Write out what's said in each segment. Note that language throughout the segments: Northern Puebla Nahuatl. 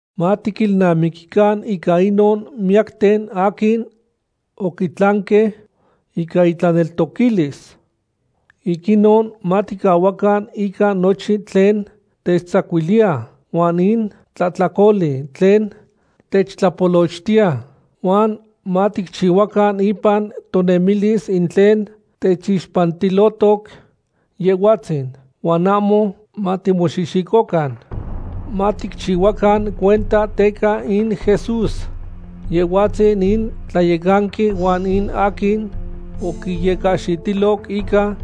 Matiquilnamiquican ica inon miyacten aquin oquitlanque ica intlaneltoquilis. Ic inon maticahuacan ica nochin tlen techtzacuiliya, huan in tlahtlacoli tlen techtlapolochtiya, huan maticchihuacan ipan tonemilis in tlen techixpantilotoc Yehhuatzin, huan ahmo matimoxihxicocan. Maticchihuacan cuenta teca in Jesús, Yehhuatzin in Tlayecanqui huan in aquin oquiyecahxitiloc ica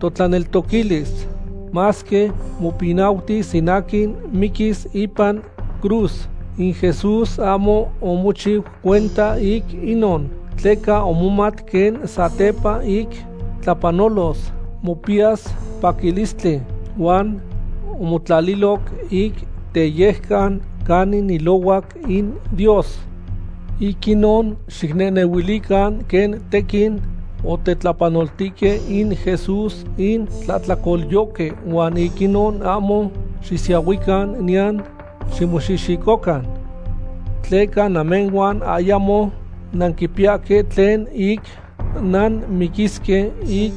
totlaneltoquilis. Masque mopinautis in aquin miquis ipan cruz, in Jesús ahmo omochiu cuenta ic inon, tleca omomat quen satepa ic tlapanolos, mopiyas paquilistli. Huan omotlaliloc ic teyejcan canin ilohuac in Dios. Ic inon xicnehnehuilican quen tequin otetlapanoltihque in Jesús in tlahtlacolyohque huan ic inon ahmo xisiahuican niyan ximoxihxicocan. Tleca namehhuan ayamo nanquipiyahque tlen ic nanmiquisque ic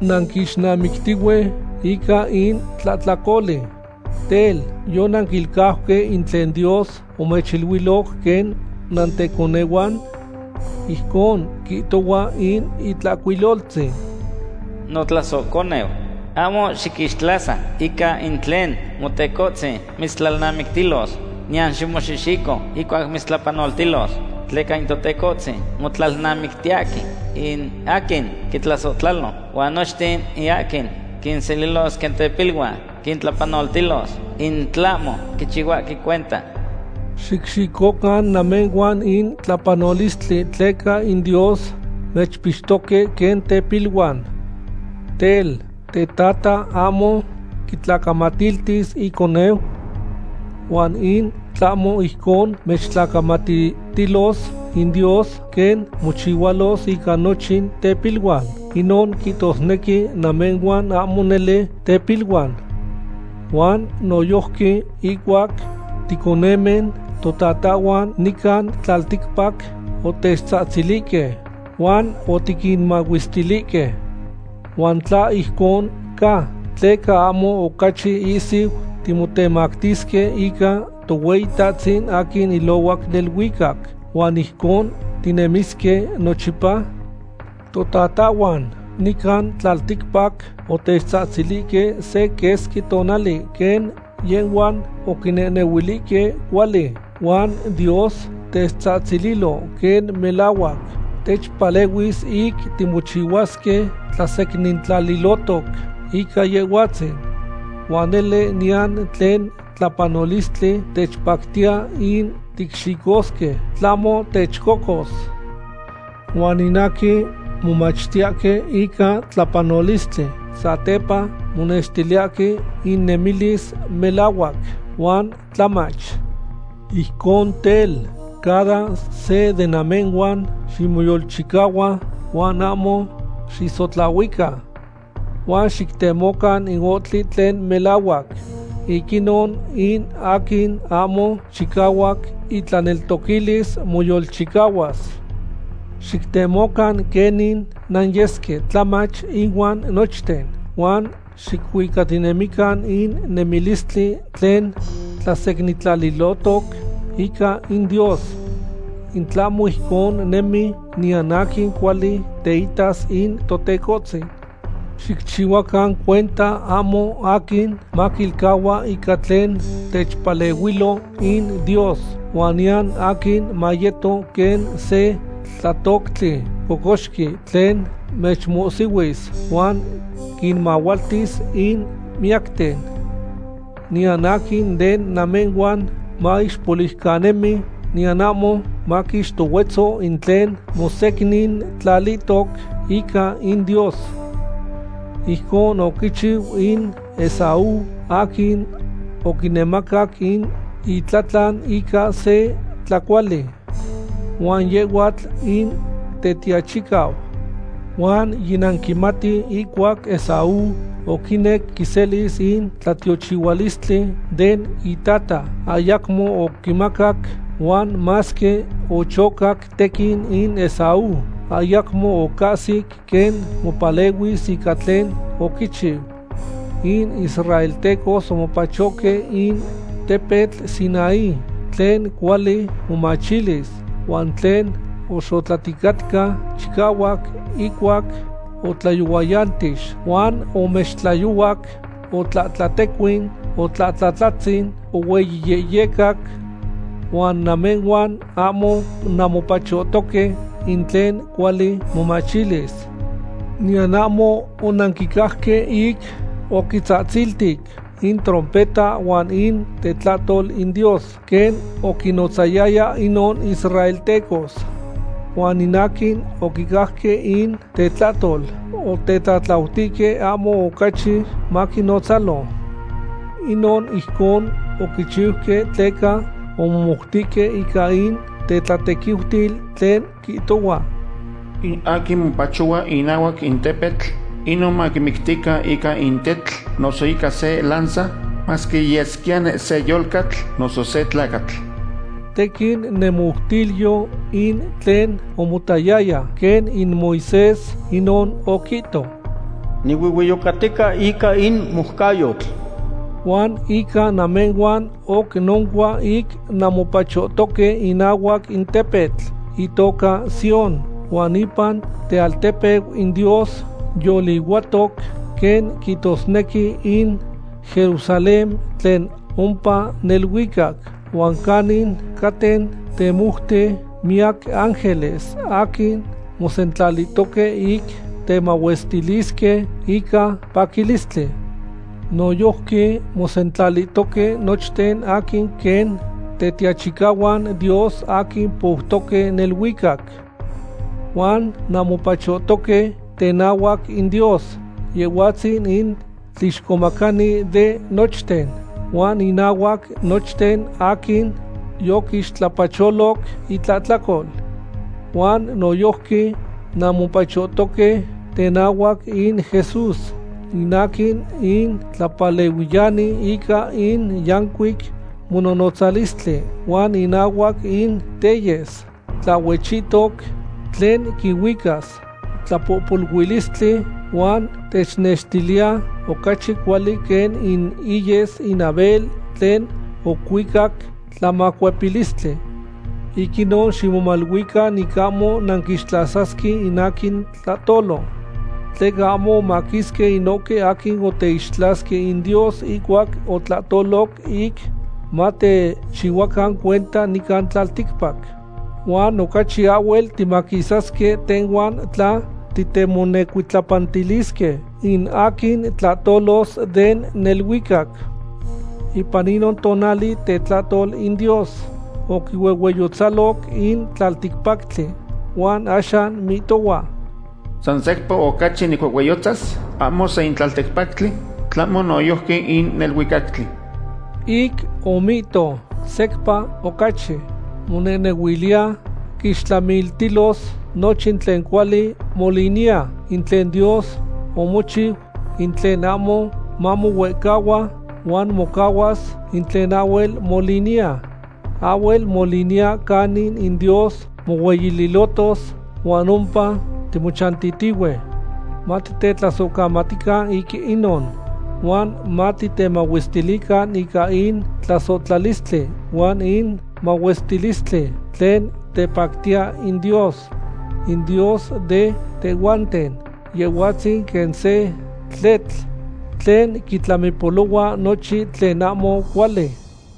nanquixnamictihue ica in tlahtlacoli. Tel, ¿yonanquilcauque in tlen Dios omechiluiloc quen nanteconehuan? Ijcon quihtohua in Itlahcuiloltzin: Notlasohconeu, ahmo xiquixtlasa ica in tlen Motecohtzin mitztlalnamictilos, niyan ximoxihxico ihcuac mitztlapanoltilos. Tleca in Totecohtzin motlalnamictiyahque in aquin quintlasohtlalo, huan nochten in aquin quinselilos quen tepiluan quintlapanoltilos in tlahmo quichihuahque cuenta. Xicxicocan namehhuan in tlapanolistli tleca in Dios mechpixtoque quen tepiluan. Tel, ¿tetata ahmo quitlacamatiltis iconeu? Huan in tlahmo ijcon mechtlacamatiltilos in Dios quen mochihualos ica nochin tepiluan, inon quihtosnequi namehhuan ahmo nele tepiluan. Huan noyojqui, ihcuac ticonemen, totatahhuan nican tlalticpac otechtzahtzilihque, huan otiquinmahuestilihque. ¿Huan tla ijcon ca, tleca ahmo ocachi ihsiu timotemactisque ica Tohueyitahtzin aquin ilohuac neluicac, huan ijcon tinemisque nochipa? Totatahhuan nican tlalticpac otechtzahtzilihque se quesqui tonali quen yehhuan oquinehnehuilihque cuali, huan Dios techtzahtzililo quen melahuac techpalehuis ic timochihuasque tlasecnintlalihtoc ica Yehhuatzin. Huan nele niyan tlen tlapanolistli techpactiya ic ticxicosque, tlahmo techcocos. Huan in aquin momachtiyahque ica tlapanolistli, satepa monextiyahque innemilis melahuac huan tlamach. Ijcon tel, cada se de namehhuan ximoyolchicahua huan ahmo xisotlahuica. Huan xictemocan in ohtli tlen melahuac. Ic inon in aquin ahmo chicahuac itlaneltoquilis moyolchicahuas. Xictemocan quenin nanyesque tlamach ihuan nochten, huan xicuicatinemican in nemilistli tlen tlasecnintlalihtoc ica in Dios. In tlahmo ijcon nemi, niyan aquin cuali teitas in Totecohtzin. Xicchihuacan cuenta ahmo aquin maquilcahua ica tlen techpalehuilo in Dios, huan niyan aquin mayeto quen se tlatoctli cocoxqui tlen mechmohsihuis huan quinmahualtis in miyacten. Niyan aquin de namehhuan maixpoliucanemi, niyan ahmo maquixtohuetzo in tlen mosecnintlalihtoc ica in Dios. Ijconon oquichiu in Esaú, aquin oquinemacac in itlatlan ica se tlacuali. Huan yehhuatl in tetiachicau. Huan yinanquimati ihcuac Esaú oquinec quiselis in tlatiochihualistli den itata, ayacmo oquimacac, huan masque ochocac tequin in Esaú, ayacmo ocahsic quen mopalehuis ica tlen oquichiu. In israeltecos omopachohque in tepetl Sinaí tlen cuali momachilis, huan tlen oxotlaticatca chicahuac ihcuac otlayohuayantix, huan omextlayohuac, otlahtlatecuin, otlahtlatlatzin, ohueyiyehyecac. Huan namehhuan ahmo nanmopachohtoque in tlen cuali momachilis. Niyan ahmo onanquicajque ic oquitzatziltic in trompeta huan in tetlahtol in Dios quen oquinotzayaya inon israeltecos. Huan in aquin oquicajque in tetlahtol otetlatlautihque ahmo ocachi maquinnotzalo. Inon ijcon oquichiuque tleca omomoutihque ica in tetlatequiutil tlen quihtohua: “In aquin mopachohua inahuac in tepetl, inon maquimictican ica in tetl noso ica se lanza, masque yesquiyani se yolcatl noso se tlacatl.” Tequin nemoutilyo in tlen omotayaya, quen in Moisés, inon oquihto: “Nihuehueyocatica ica in moucayotl.” Huan ica namehhuan oc noncua ic nanmopachohtoque inahuac in tepetl itoca Sión huan ipan tealtepeu in Dios yolihuatoc, quen quihtosnequi in Jerusalén tlen ompa neluicac, huan canin caten temoute miyac ángeles aquin mosentlalihtoque ic temahuestilisque ica paquilistli. Noyojqui mosentlalihtoque nochten aquin quen tetiachicahuan Dios aquin poutoque neluicac. Huan nanmopachohtoque tenahuac in Dios, Yehhuatzin in tlixcomacani de nochten, huan inahuac nochten aquin yoquixtlapacholoc intlahtlacol. Huan noyojqui nanmopachohtoque tenahuac in Jesús, in aquin in tlapalehuiyani ica in yancuic mononotzalistli, huan inahuac in teyes tlahhuechihtoc tlen quihuicas tlapohpoluilistli, huan technextiliya ocachi cuali quen in iyes in Abel tlen ocuicac tlamacuepilistli. Ic inon, ximomaluican ic ahmo nanquixtlasasque in aquin tlahtolo. Tleca ahmo omaquisque inohque aquin oteixtlasque in Dios ihcuac otlahtoloc ic matechihuacan cuenta nican tlalticpac. Huan ocachi ahhuel timaquisasque tehhuan tla titemonecuitlapantilisque in aquin tlahtolos den neluicac. Ipan inon tonali tetlahtol in Dios oquihuehueyotzaloc in tlalticpactli. Huan axan mihtohua: “San secpa ocachi nicuehueyotzas ahmo san in tlalticpactli, tlahmo noyojqui in neluicactli.” Ic omihto “secpa ocachi”, monehnehuiliya quixtlamiltilos nochin tlen cuali moliniya, in tlen Dios omochiu, in tlen ahmo mamohuehcahua, huan mocahuas in tlen ahhuel moliniya. Ahhuel moliniya canin in Dios mohueyililotos, huan ompa timochantitihue. Matitetlasohcamatican ic inon, huan matitemahuestilican ica in tlasohtlalistli huan in mahuestilistli tlen tepactiya in Dios. In Dios de tehhuanten, Yehhuatzin quen se tletl tlen quitlamipolohua nochin tlen ahmo cuali.